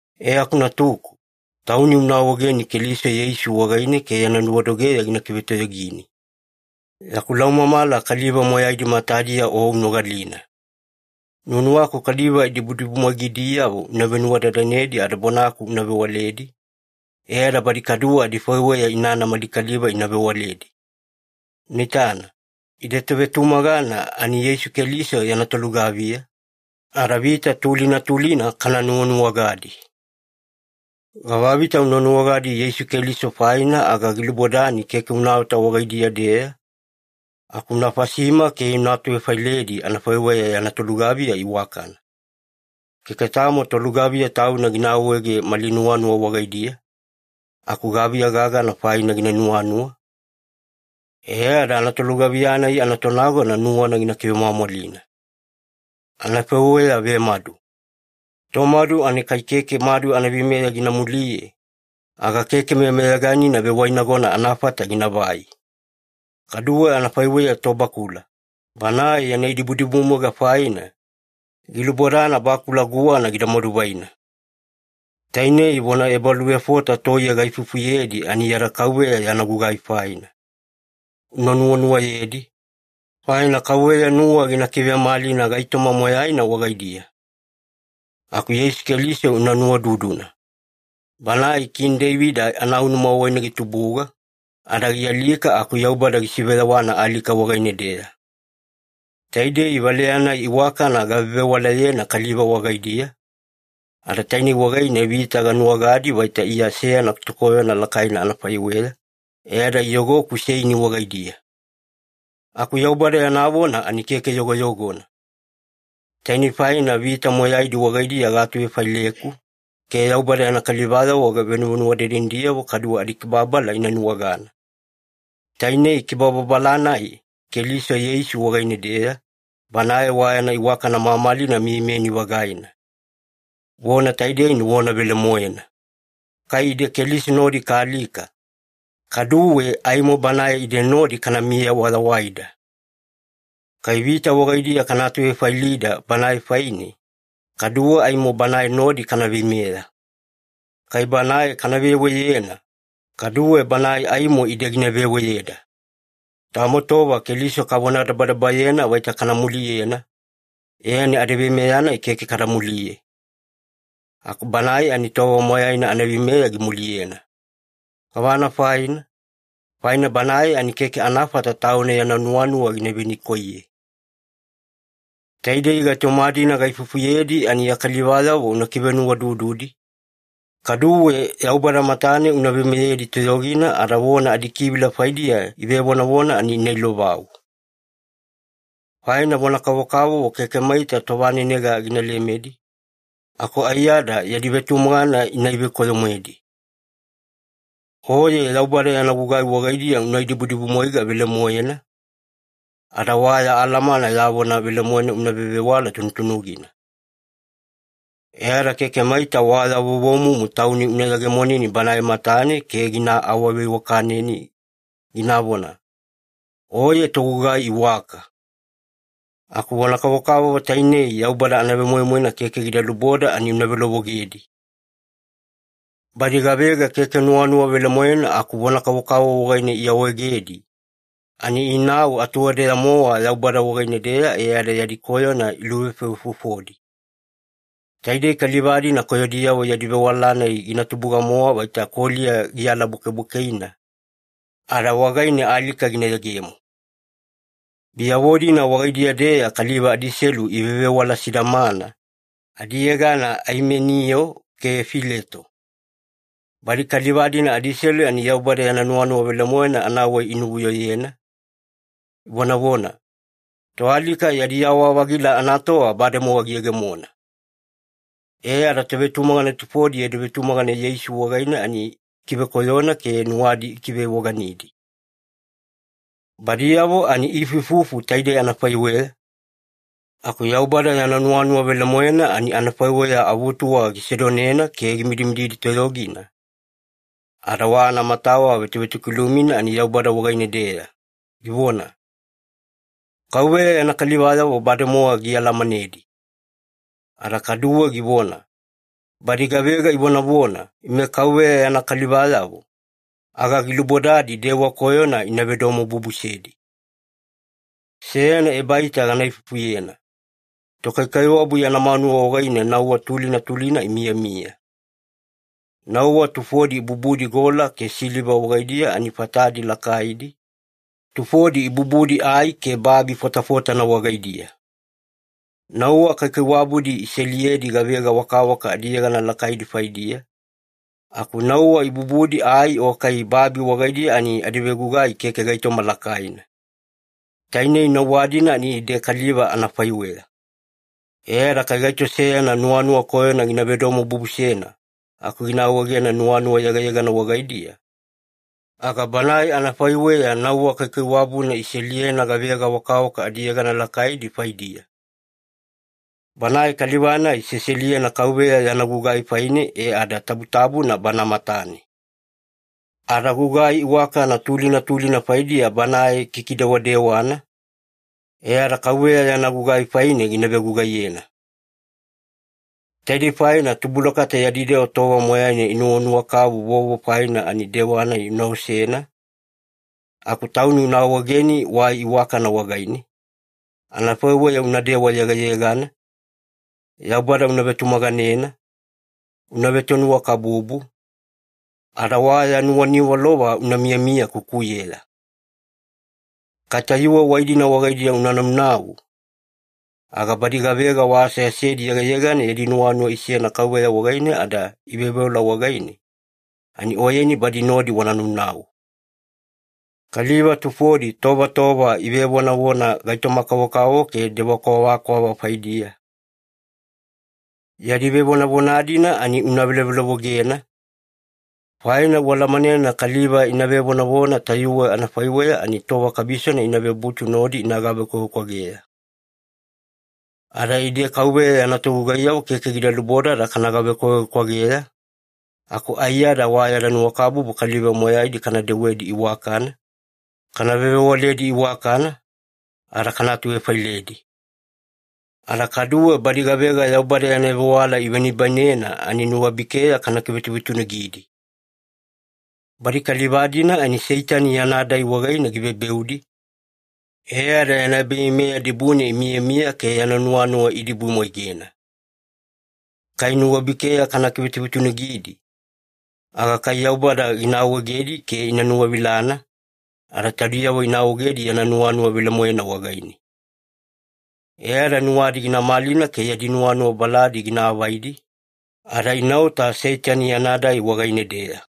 E aku natuku, tauni una awaegeni Keliso Yeisu wagaine ke yana nuwadogeya gina kivetoyogini. Yaku laumamala kaliva moyaidi matadiya o unogalina. Nuwanuwaku kaliva idibudibumwaigadiyavo una venuwadadanedi ada bonaku una vewaledi, e ada badi kaduwe adifaiweya inana mali kaliva ina vewaledi. Una itana, ide tovetumagana ani Yeisu Keliso yana tolugaviya, ada vita tulina tulina kana nuwanuwagadi. Gavavita una nuwagadi Yeisu Keliso faina aga gilubodani keke unaota wagaidiya-deya, aku una fasima ke una atuvefailedi anafaiweya yana tolugaviya iwakana. Keke tamo tolugaviya tauna gina awaege mali nuwanuwa wagaidiya, aku gaviya gagana faina gina nuwanuwa e ada tolugaviya-nai anatonagona nuwana gina kivemwamwalina. Anafaiweya vemadu. Tomadu ani kai keke madu anaveimeya gina muliye, aga keke meyameyaganina vewainagona anafata ginavai. Kaduwe anafaiweya tobakula, banae yana idibudibumwaiga faina, gilubodana bakula guwana gida maduvaina. Tainei vona ebaluvefota toiye gaifufuyedi ani yada Kauveya yana gugai faina. Una nuwanuwayedi, faina Kauveya nuwa gina kivemalina gaitoma moyaina wagaidiya. Aku Yeisu Keliso una nuwaududuna. Banae Kini Deivida anaunuma wagaine gitubuga, ada gialika aku Yaubada gisiveyawana alika wagaine-deya. Taidei valeya-nai iwakana gavevewalayena kaliva wagaidiya, ada tainei wagaine vita ganuwagadi vaita Iya seyana tokoyona lakaina anafaiweya, e ada iyogoku seini wagaidiya. Aku Yaubada yana vona ani keke yogoyogona! Tainei faina vita moyaidi wagaidiya gaatuvefaileku, ke Yaubada yana kalivayavo venuvenuwadadanidiyavo kaduwe adikibababala ina nuwagana. Tainei kibababala-nai Keliso Yeisu wagaine-deya, Banae wa yana iwakana mamalina miyamiyani-vagaina. Vona taidei ani vona velemoena: Kai ide Keliso nodi kaalika, kaduwe aimo Banae ide nodi kanamiya wayawaida. Kai vita wagaidiya kana atuvefailida Banae faine, kaduwe aimo Banae nodi kana veimeya. Kai Banae kana veweyena, kaduwe Banae aimo ide gina veweyeda. Tamo tova Keliso kavonadabadabayena vaita kana muliyena e ani yada veimeya-nai keke kada muliye, aku Banae ani tova moyaina yana veimeya gimuliyena. Gavana faina? Faina Banae ani keke anafata Tauna yana nuwanuwa gina venikoiye. Taidei gaitoma-dina gaifufuyedi ani ya kalivayavo una kivenuwaudududi, kaduwe Yaubada matane una veimeyedi toyogina ada vona adikivila faidiya ivevonavona ani ina ilovau. Faina vona kavokavovo keke maita tovanenega gina lemedi, aku aiyada yadi vetumagana gina ivekoyo-moedi. Oye Yaubada yana gugai wagaidiya una idibudibumwaiga velemoena, ada wa ya alamana yana vona velemoena una vevewala tunutunugina. E ada keke maita wa ya vovomumu tauni una yegemoneni Banae matane ke gina awaveiwakaneni, ginavona, “Oye togugai iwaka.” Aku vona kavokavovo tainei Yaubada anavemoimoina keke gida luboda ani una velovogedi. Badi gavega keke nuwanuwa velemoena aku vona kavokavovo wagaine iawaegedi, ani inau atuwadeya-mowa Yaubada wagaine-deya e ada yadi koyona iluvefovefofodi. Taidei kaliva-dina koyodiyavo yadi vewala-nai gina tubuga-mowa vaita koliya gialabwakebwakeina, ada wagaine alika gina yegemo. Biyavo-dina wagaidiya-deya kaliva adiselu ivevewala sidamana, adiyegana Aimeniyo ke Fileto. Badi kaliva-dina adiselu ani Yaubada yana nuwanuwa velemoena anawai inuvuyoyena, ivonavona, “Toalika yadi yawa-vagila anatova bademowa giyegemona.” E ada tovetumagana tufodi yadi vetumagana Yeisu wagaine ani ikivekoyona ke nuwadi ikivevoganidi. Badiyavo ani iifuifufu taidei anafaiweya, aku Yaubada yana nuwanuwa velemoena ani anafaiweya avutuwa gisedonena ke gimidimididi toyogina, ada wa anamatawa vetovetokilumina ani Yaubada wagaine-deya, givona, “KAUVEYA yana kalivayavo bademowa gialamanedi.” Ada kaduwe givona, “Badi gavega ivonavona, ‘Ime KAUVEYA yana kalivayavo,’ aga gilubodadi dewa koyona ina vedomobubusedi.” Seyana ebaita gana ifufuyena. Tokaikaiwabu yana manuwa wagaine nauwa tulina tulina imiyamiya. Nauwa tufodi ibubudi gola ke siliva wagaidiya ani fatadi lakaidi, tufodi ibubudi ai ke babi fotafotana wagaidiya. Nauwa kaikaiwabudi iseliyedi gavega wakawaka adiyegana lakaidi faidiya, aku nauwa ibubudi ai o kai babi wagaidiya ani adivegugai keke gaitoma lakaina. Tainei nauwa-dina ani ide kaliva anafaiweya. E ada kai gaito seyana nuwanuwa koyona gina vedomobubusena aku gina awaegena nuwanuwa yegayegana wagaidiya, aga banae anafaiweya nauwa kaikaiwabuna iseliyena gavega wakawaka adiyegana lakaidi faidiya. Banae kaliva-nai seseliyena Kauveya yana gugai faine e ada tabutabuna Bana matane. Ada gugai iwakana tulina tulina faidiya banae kikidewadewana, e ada Kauveya yana gugai faine gina vegugaiyena. Taidei faina tubulakata yadi dewa tova moyaina inuwanuwa kavu vovo faina ani dewa-nai una osena, aku tauni una awaegeni wai iwakana wagaine, anafaiweya unadewa yegayegana, Yaubada una vetumaganena, una vetonuwakabubu, ada wa ya nuwaniwalova una miyamiya kukuyeya. Kai tayuwe wai-dina wagaidiya una naunau, aga badi gavega wa aseasedi yegayegana yadi nuwanuwa isena Kauveya wagaine ada iveoveola wagaine, ani oyeni badi nodi wana naunau. Kaliva tufodi tova tova ivevonavona gaitoma-kavokavovo ke dewa kwavakwava faidiya. Yadi vevonavona-dina ani una velovelovogena, faina ualamanena kaliva ina vevonavona tayuwe anafaiweya ani tova kabisona ina vebutu nodi ina gavekwavekwageya. Ada ide Kauveya yana togugaiyavo keke gida lubodada kana gavekwavekwageya, aku aiyada wa yada nuwakabubu kaliva moyaidi kana dewedi iwakana, kana vevewaledi iwakana, ada kana atuvefailedi. Ada kaduwe badi gavega Yaubada yana vewala ivenibainena ani nuwabikeya kana kivetuvetunugidi. Badi kaliva-dina ani Seitani yana dai wagaine givebeudi, e ada yana ebaveimeya dibune imiyamiya ke yana nuwanuwa iidibumwaigena. Kai nuwabikeya kana kivetuvetunugidi, aga kai Yaubada gina awaegedi ke ina nuwavilana, ada taudiyavo ina awaegedi yana nuwanuwa velemoena wagaine. E ada nuwadi gina malina ke yadi nuwanuwa baladi gina avaidi, ada inaota Seitani yana dai wagaine-deya.